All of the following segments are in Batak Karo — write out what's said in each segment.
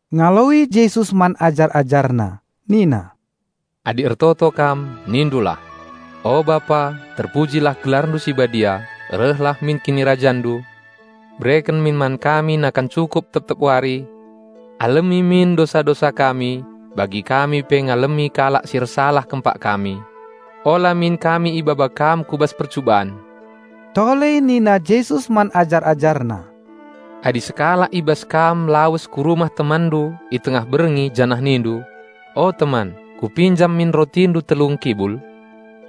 Ngaloi Jesus man ajar-AjarNa nina, "Adi ertoto kam nindulah, 'O Bapa, Terpujilah gelarndu si Badia; Rehlah min KinirajanNdu, Bereken min man kami nakan cukup tep-tep wari. Alemi min dosa-dosa kami, balira kami pe ngalemi kalak si ersalah kempak kami. Ola min kami ibaba Kam ku bas percuban.'" Tole nina Jesus man ajar-AjarNa, "Adi sekalak i bas kam lawes ku rumah temanndu i tengah berngi janah nindu, 'O teman, kupinjam min rotindu telu ngkibul,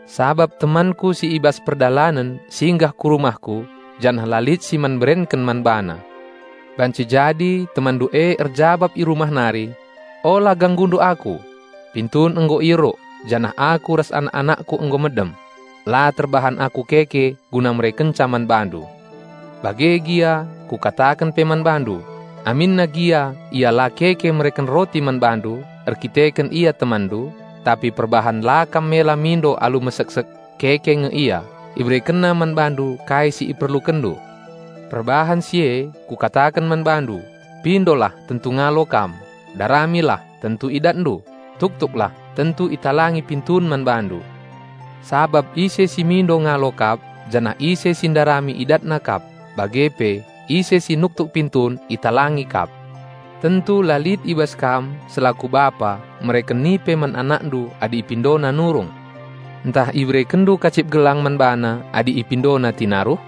sabap temanku si i bas perdalanen singgah ku rumahku janah la lit si man berenken man bana.' Banci jadi temanndu e erjabap i rumah nari, 'Ola ganggundu aku! Pintun nggo ieruk, janah aku ras anak-anakku nggo medem. La terbahan aku keke guna merekenca man bandu.' Bage gia, Kukataken pe man bandu, aminna gia ia la keke mereken roti man bandu erdandanken ia temanndu, tapi perbahan la kam mela mindo alu meseksek, keke nge ia, iberekenna man bandu kai si iperlukenndu. Perbahan si e Kukataken man bandu: Pindolah tentu ngalo kam; daramilah, tentu idatndu; tuktuklah, tentu italangi pintun man bandu. Sabap ise si mindo ngalo kap, janah ise si ndarami idatna kap, bage pe ise si nuktuk pintun italangi kap. Tentu la lit i bas kam selaku bapa mereken nipe man anakndu adi ipindona nurung. Ntah iberekenndu kacip gelang man bana adi ipindona tinaruh.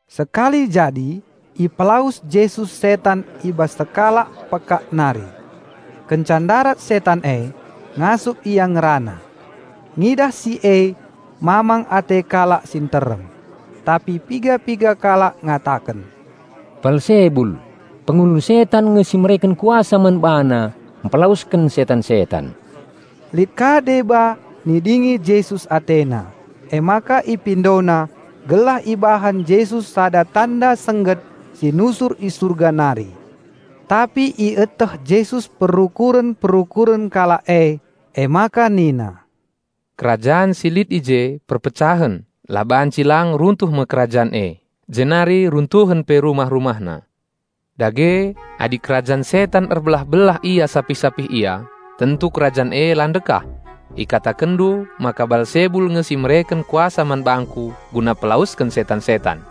Sekali jadi ipelawes Jesus setan i bas sekalak pekak nari. Kenca ndarat setan e, ngasup ia ngerana. Ngidah si e mamang ate kalak si nterem. Tapi piga-piga kalak ngataken, "Balsebul, pengulu setan nge si mereken kuasa man BaNa mpelawesken setan-setan." Lit ka deba nidingi Jesus atena, emaka ipindona gelah ibahan Jesus sada tanda sengget si nusur i Surga nari. Tapi ieteh Jesus perukuren-perukuren kalak e, emaka nina, "Kerajan si lit i je perpecahen, la banci lang runtuh me kerajan e, jenari runtuhen pe rumah-rumahna. Dage, adi kerajan setan erbelah-belah ia sapih-sapih ia, tentu kerajan e la ndekah. Ikatakenndu maka Balsebul nge si mereken kuasa man bangKu guna pelawesken setan-setan.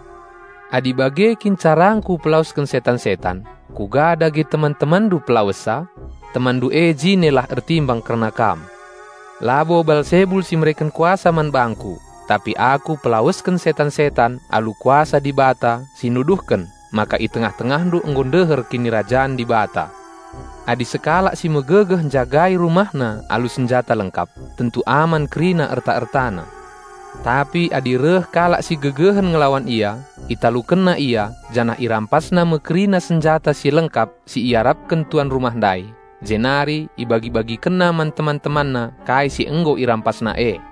Adi bage kin carangKu pelawesken setan-setan, kuga dage teman-temanndu pelawessa? Temanndu e jinelah ertimbang kerna kam. Labo Balsebul si mereken kuasa man bangKu, tapi Aku pelawesken setan-setan alu kuasa Dibata si nuduhken maka i tengah-tengahndu nggo ndeher Kinirajan Dibata. Adi sekalak si megegeh njagai rumahna alu senjata lengkap, tentu aman kerina erta-ertana. Tapi adi reh kalak si gegehen ngelawan ia, italukenna ia janah irampasna me kerina senjata si lengkap si iarapken tuan rumah ndai, jenari ibagi-bagikenna man teman-temanna kai si nggo irampasna e.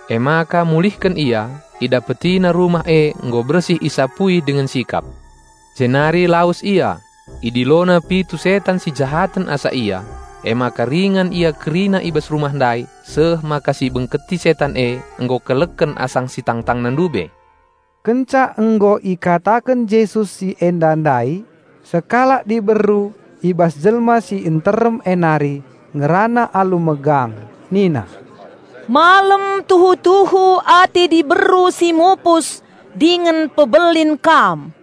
Emaka mulihken ia, idapetina rumah e nggo bersih isapui dingen sikap. Jenari lawes ia, idilona pitu setan si jahaten asa ia. Emaka ringan ia kerina i bas rumah ndai seh maka si ibengketi setan e nggo keleken asang si tangtangna ndube." Kenca nggo ikataken Jesus si enda ndai, sekalak diberu i bas jelma si nterem e nari ngerana alu megang nina, "Malem tuhu-tuhu ate diberu si mupus dingen pebelin Kam!"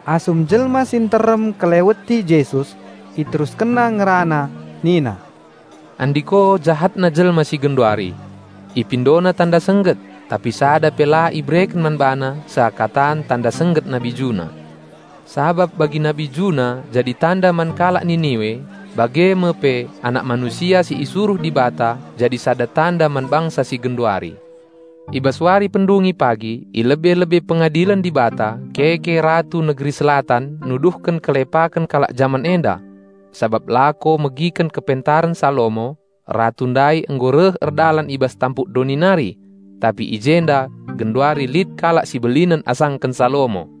Asum jelma si nterem ngkeleweti Jesus, IteruskenNa ngerana nina, "Andiko jahatna jelma si genduari! Ipindona tanda sengget, tapi sada pe la ibereken man bana seakatan tanda sengget Nabi Juna. Sabap bagi Nabi Juna jadi tanda man kalak Niniwe, bage me pe Anak Manusia si isuruh Dibata jadi sada tanda man bangsa si genduari. I bas wari pendungi pagi i lebe-lebe Pengadilen Dibata keke Ratu negeri Selatan nuduhken kelepaken kalak jaman enda. Sabap lako megikenken pengajaren kepentaren Salomo, Ratu ndai nggo reh erdalan i bas tampuk doni nari. Tapi i jenda genduri lit kalak si belinen asangken Salomo!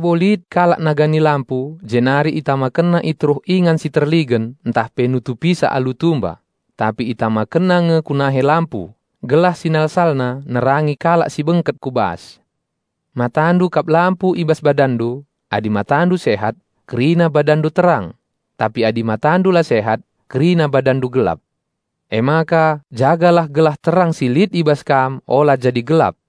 "Labo lit kalak nagani lampu, jenari itamakenna i teruh ingan si terligen ntahpe nutupisa alu tumba; tapi itamakenna nge ku nahe lampu, gelah sinalsalna nerangi kalak si bengket ku bas. Matandu kap lampu i bas badanndu. Adi matandu sehat, kerina badanndu terang; tapi adi matandu la sehat, kerina badanndu gelap. Emaka jagalah gelah terang si lit i bas kam ola jadi gelap.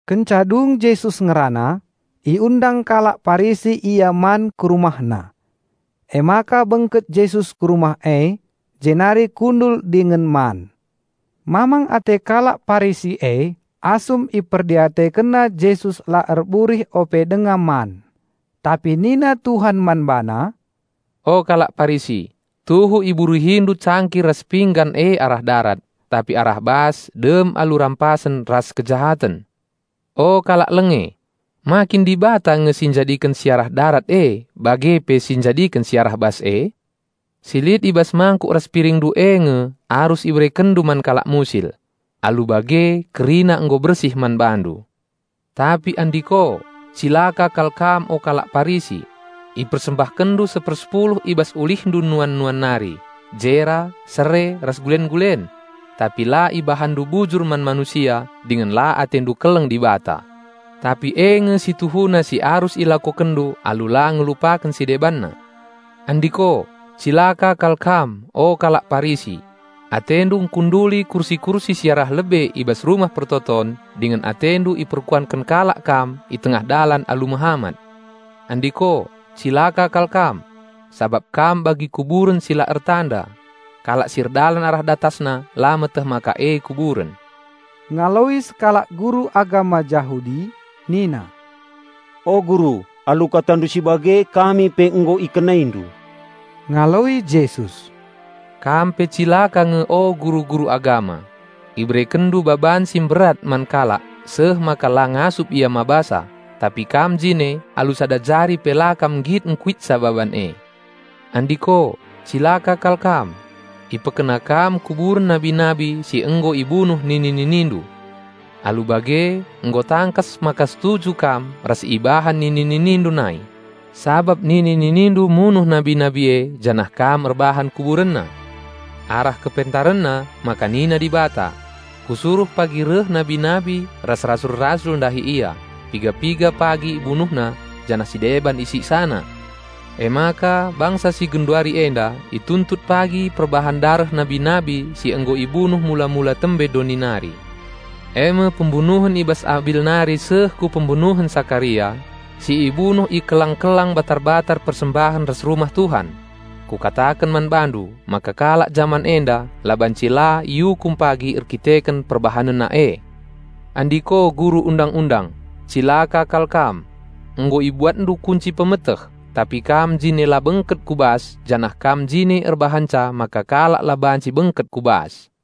Kenca dung Jesus ngerana, iundang kalak Parisi Ia man ku rumahna. Emaka bengket Jesus ku rumah e, jenari kundul dingen man. Mamang ate kalak Parisi e asum iperdiatekenna Jesus la erburih ope denga man. Tapi nina Tuhan man bana, "O kalak Parisi, tuhu iburihindu cangkir ras pinggan e arah darat, tapi arah bas dem alu rampasen ras kejahaten. O kalak lenge! Ma kin Dibata nge si njadiken si arah darat e bage pe si njadiken si arah bas e? Si lit i bas mangkuk ras piringndu e nge arus iberekenndu man kalak musil. Alu bage kerina nggo bersih man bandu. Tapi andiko, cilaka kal kam o kalak Parisi: Ipersembahkenndu sepersepuluh i bas ulihndu nuan-nuan nari: jera, sere, ras gulen-gulen; tapi la ibahanndu bujur man manusia dingen la atendu keleng Dibata. Tapi e nge si tuhuna si arus ilakokenndu alu la ngelupaken si debanna. Andiko, cilaka kal kam o kalak Parisi! Atendu ngkunduli kursi-kursi si arah lebe i bas rumah persembahen dingen atendu iperkuanken kalak kam i tengah dalan alu mehamat. Andiko, cilaka kal kam! Sabap kam bagi kuburen si la ertanda; kalak si erdalan arah datasna la meteh maka e kuburen." Ngaloi sekalak guru agama Jahudi nina, "O Guru, alu KataNdu si bage, kami pe nggo IkenaiNdu." Ngaloi Jesus, "Kam pe cilaka nge o guru-guru agama! Iberekenndu baban si mberat man kalak seh maka la ngasup ia mbabasa, tapi kam jine alu sada jari pe la kam nggit ngkuitsa baban e. Andiko, cilaka kal kam! Ipekena kam kuburen nabi-nabi si nggo ibunuh nini-ninindu. Alu bage nggo tangkas maka setuju kam ras si ibahan nini-ninindu nai; sabap nini-ninindu munuh nabi-nabi e janah kam erbahan kuburenna. Arah KepentarenNa maka nina Dibata, 'Kusuruh pagi reh nabi-nabi ras rasul-rasul ndahi ia; piga-piga pagi ibunuhna janah si deban isiksana.' Emaka bangsa si genduari enda ituntut pagi perbahan dareh nabi-nabi si nggo ibunuh mula-mula tembe doni nari, e me pembunuhen i bas Abil nari seh ku pembunuhen Sakaria si ibunuh i kelang-kelang batar-batar persembahen ras Rumah Tuhan. Kukataken man bandu maka kalak jaman enda la banci la iukum pagi erkiteken perbahanenna e. Andiko guru Undang-undang, cilaka kal kam! Nggo ibuatndu kunci pemeteh; tapi kam jine la bengket ku bas janah kam jine erbahanca maka kalak la banci bengket ku bas!"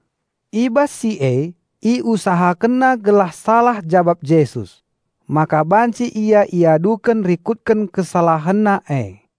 I bas si e iusahakenna gelah salah jabap Jesus, maka banci Ia iaduken rikutken KesalahenNa e.